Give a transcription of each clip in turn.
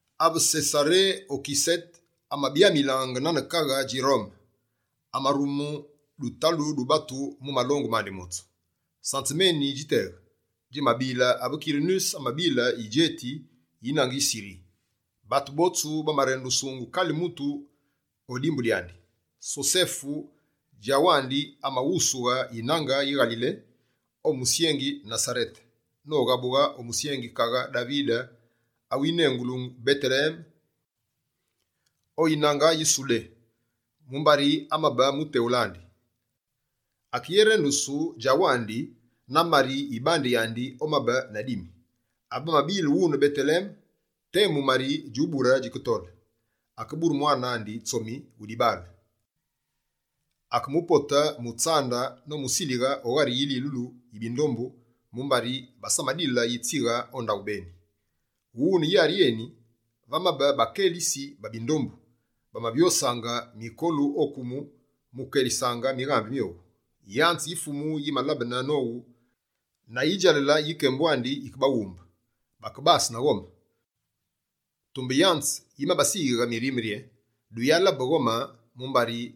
Ave Sesare Okisete amabyamilaange nane kaghe dji Rome, amarume dutalu du batu mu malongu mandi motsu. Sanzeme eni djiteghe, djimabile ave Kirinuse amabile yidjeti yi yinange yi Siri. Batu botsu bamerendusungu kale mutu o dyandi dimbu. Sosefe djawandi, amaghusughe yinange yi Ngalile o musyengi Nasarete noghabughe o musyengi kaghe Davide awinengulu Beteleme, o yinange yi Sudé. Mumbari amabe muteghule andi. Akeyerendusu djawandi na Mari yibande yandi omabe na dimi. Ave bamabile wune Beteleme, temu Mari djubure djiketole. Akebure mwane andi tsomi wu dibaale, akemupote mu tsande nomusilighe o ghari yililu yi bindombu, mumbari basamadile yitsighe o ndaghu beni. Wune yari yeni, vamabe bakelitsi ba bindombu bamavyosaange mikolu o kumu mu ukelisaange mighambe myowu. Yanze yi Fumu yimalabene nowu na yidjalale yi kembu andi yikebaghumbe. Bakebase na ghome. Tumbe yanze yimabasiyighe mirime rye: «Duyabe na ghome, mumbari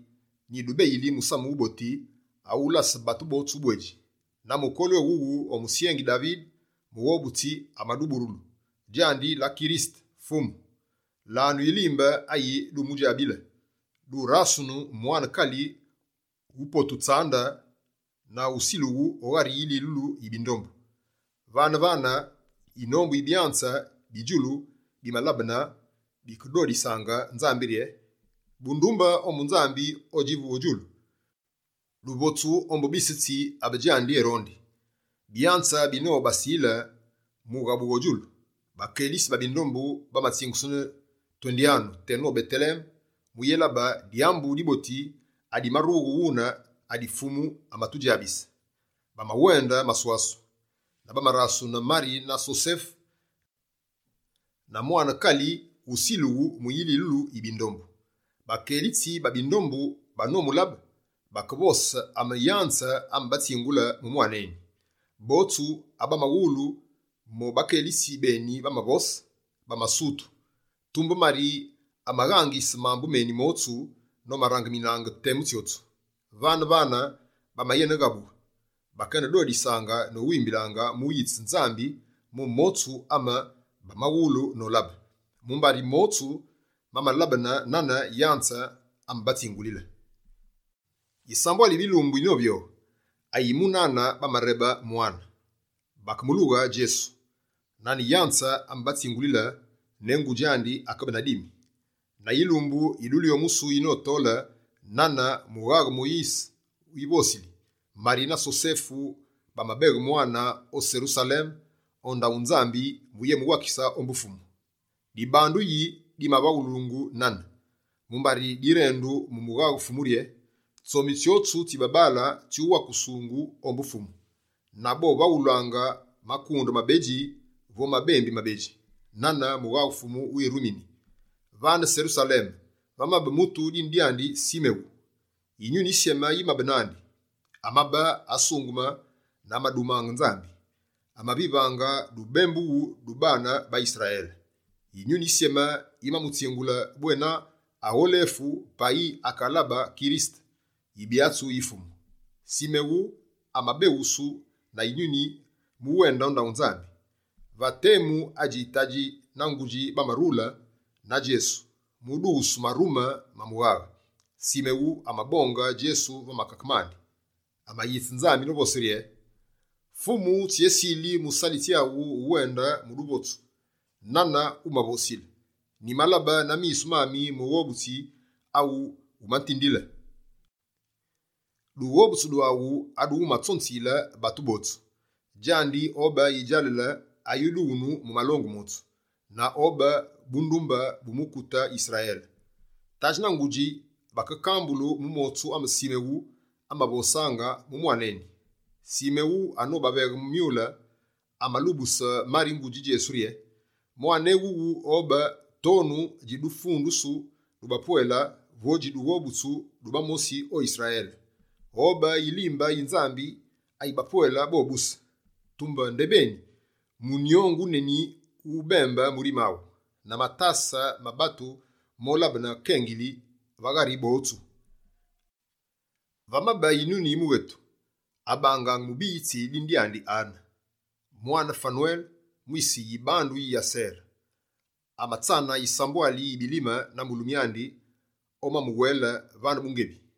nyidubeyili musamu wuboti awulase batu botsu ubwedji. Na mukolu ewuwu, o musyengi Davide Mughobutsi amaduburulu, djandi la Kirisete, Fumu. Lanu yilimbe ayi dumudjabile: durasunu mwane kali wupotu tsande na wusilughu o ghari yililulu yi bindombu.» Vane-vane, yinombu yi byanze bi djulu bimalabene. Bikedodisaange Nzambi rye: «Bundumbe ombu Nzambi odjivu o djulu. Duvotsu ombu bise tsi abe djandi erondi.» Byanze binobasile mu ughabughe o djulu, bakelitsi ba bindombu bamatsingusene: «Twendyanu teno Beteleme mu uyélabe dyambu diboti adimarughe wune adi Fumu amatudjabise.» Bamawende maswasu, na bamarasune Mari na Sosefe na mwane kali wusilughu mu yililu yi bindombu. Bakelitsi ba bindombu banomulabe, bakevose ame yanze amabatsingule mu mwane eni. Botsu abamawulu mo bakelitsi beni bamavose, bamasutu. Tumbe Mari amaghangise mambu meni motsu nomarangiminaange temu tsyotsu. Vane-vane bamayeneghabughe, bakenedodisaange nowimbilaange mu uyitse Nzambi mu motsu ame bamawulu nolabe. Mumbari motsu mamalabene nane yanze amabatsingulile. Yisambwali yi bilumbu na yivyoghi, ayi munane, bamarebe mwane. Bakemulughe Djesu, nane yanze amabatsingulile ne ngudji andi akabe na dimi. Na yilumbu yi dulyomusu yitoli nane mughaghe Moyise wivosili, Mari na Sosefe bamabeghe mwane o Serusaleme o ndaghu Nzambi mu uyémuwakise ombu Fumu. Dibandu yi dimavaghulungu nane? Mumbari direndu mu mughaghe Fumu rye: «Tsomi tsyotsu tsi babaale tsyuwakusungu ombu Fumu.» Na bovaghulaange «makunde mabedji vo mabembi mabedji» nane mughaghe Fumu wirumini. Vane Serusaleme, vamabe mutu dine dyandi Simewu. Yinyuni Yisyeme yimabe nandi. Amabe asungeme na amadumange Nzambi. Amavivaange dubembughu du baane ba Yisrayele. Yinyuni Yisyeme, yimamutsingule bwena agholefu payi akalabe Kirisete, Yibyatsi yi Fumu. Simewu amabeghusu na Yinyuni mu uwende o ndaghu Nzambi. Va temu adji tadji na ngudji, bamarule na Djesu mu udughusu marume ma mughaghe. Simewu amabonge Djesu va makake mandi. Amayitse Nzambi novose rye: «Fumu tsyesili musalitsi aghu uwende mu duvotsu nane wumavosile. Nyimalabe Mughobutsi aghu umatutindile, na misu mami. Dughobutsu dwaghu adu wumatsonziyile batu botsu. Djandi obe yidjalale ayudughunu mu malongu motsu, na obe bundumbe bu mukute Yisrayele.» Tadji na ngudji bakekambulu mu motsu ama Simewu amavosaange mu mwane eni. Simewu anobaveghe myule, amalubuse Mari ngudji Djesu rye: «Mwane eni wuwu obe tonu dji dufundusu du bapwele vo dji dughobutsu du bamosi o Yisrayele. Obe yilimbe yi Nzambi ayi bapwele bobuse. Tumbe ndebeni, munyongu wuneni wubembe murime aghu. Na matase ma batu molabene kengili va ghari botsu.» Vamabe yinunu yi mughetu, abangaange mubiyitsi dine dyandi Ane. Mwane Fanwele mwise yibandu yi Asere. Amatsane yisambwali yi bilime na mulumi andi omamuwele vane bungebi.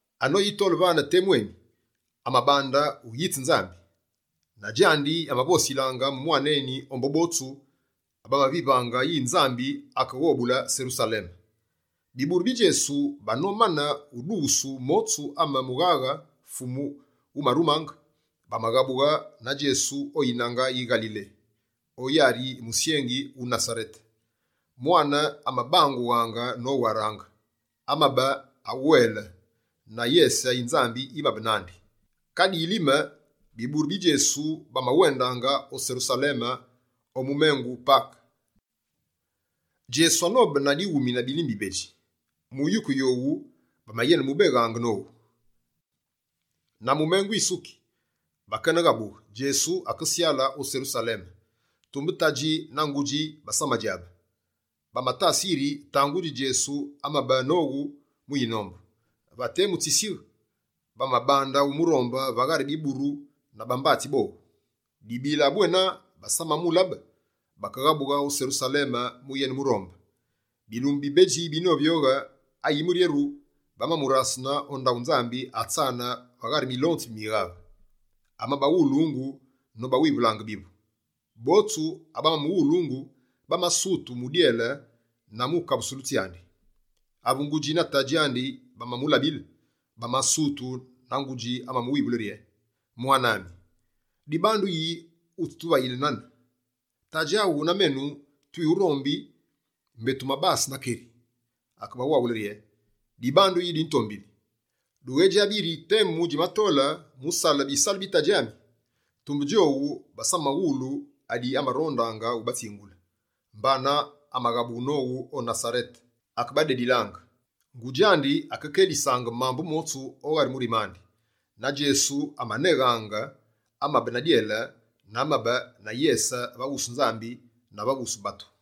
Anoyitole vane temu eni, amabande uyitse Nzambi. Na djandi amavosilaange mu mwane eni ombu botsu abamavivaange yi Nzambi akeghobule Serusaleme. Biburu bi Djesu banomane udughusu motsu ame mughaghe Fumu wumarumange, bamaghabughe na Djesu o yinange yi Ngalile o yari yi musyengi wu Nasarete. Mwane amabangughaange nowaraange. Amabe aweele, na yese yi Nzambi yimabe nandi. Kadi yilime, biburu bi Djesu bamawendaange o Serusaleme o mumengu Pake. Djesu anobe na dighumi na bilime bibedji, mu yuku yowu bamayenemubeghaange nowu. Na mumengu wisuki, bakene ghabughe, Djesu akesyale o Serusaleme. Tumbe tadji na ngudji basamadjabe. Bamatase yiri tangudji Djesu amabe nowu mu yinombu. Va temu tsisighe, bamabande umurombe va ghari biburu na bambatsi bowu. Dibila bwena basamamulabe, bakeghabughe o Serusaleme mu uyenemurombe. Bilumbu bibedji binovyoghe, ayimuryeru, bamamurasune o ndaghu Nzambi atsane va ghari milonzi mi mighaghe. Amabaghulungu nobawivulaange bivu. Botsu abamamuwulungu bamasutu mu dyele na mu kabusulu tsyandi. Ave ngudji na tadji andi bamamulabile, bamasutu, na ngudji amamuwivule rye: «Mwane ami, dibandu yi wutsituvayile nane? Tadji aghu na menu twiwurombi, mbé tumabase na keri.» Akebawake rye: «Dibandu yi dwitombili? Dughédjabi yiri temu djimatole, mu usale bisalu bi Tadji ami?» Tumbe djowu basamawulu adi amarondaange ubatsingule. Mbana amaghabughe nowu o Nasarete, akebadedilaange. Ngudji andi amakelisaange mambu motsu o ghari murime andi. Na Djesu amaneghaange, amabe na dyele, na amabe na yese va wusu Nzambi na va wusu batu.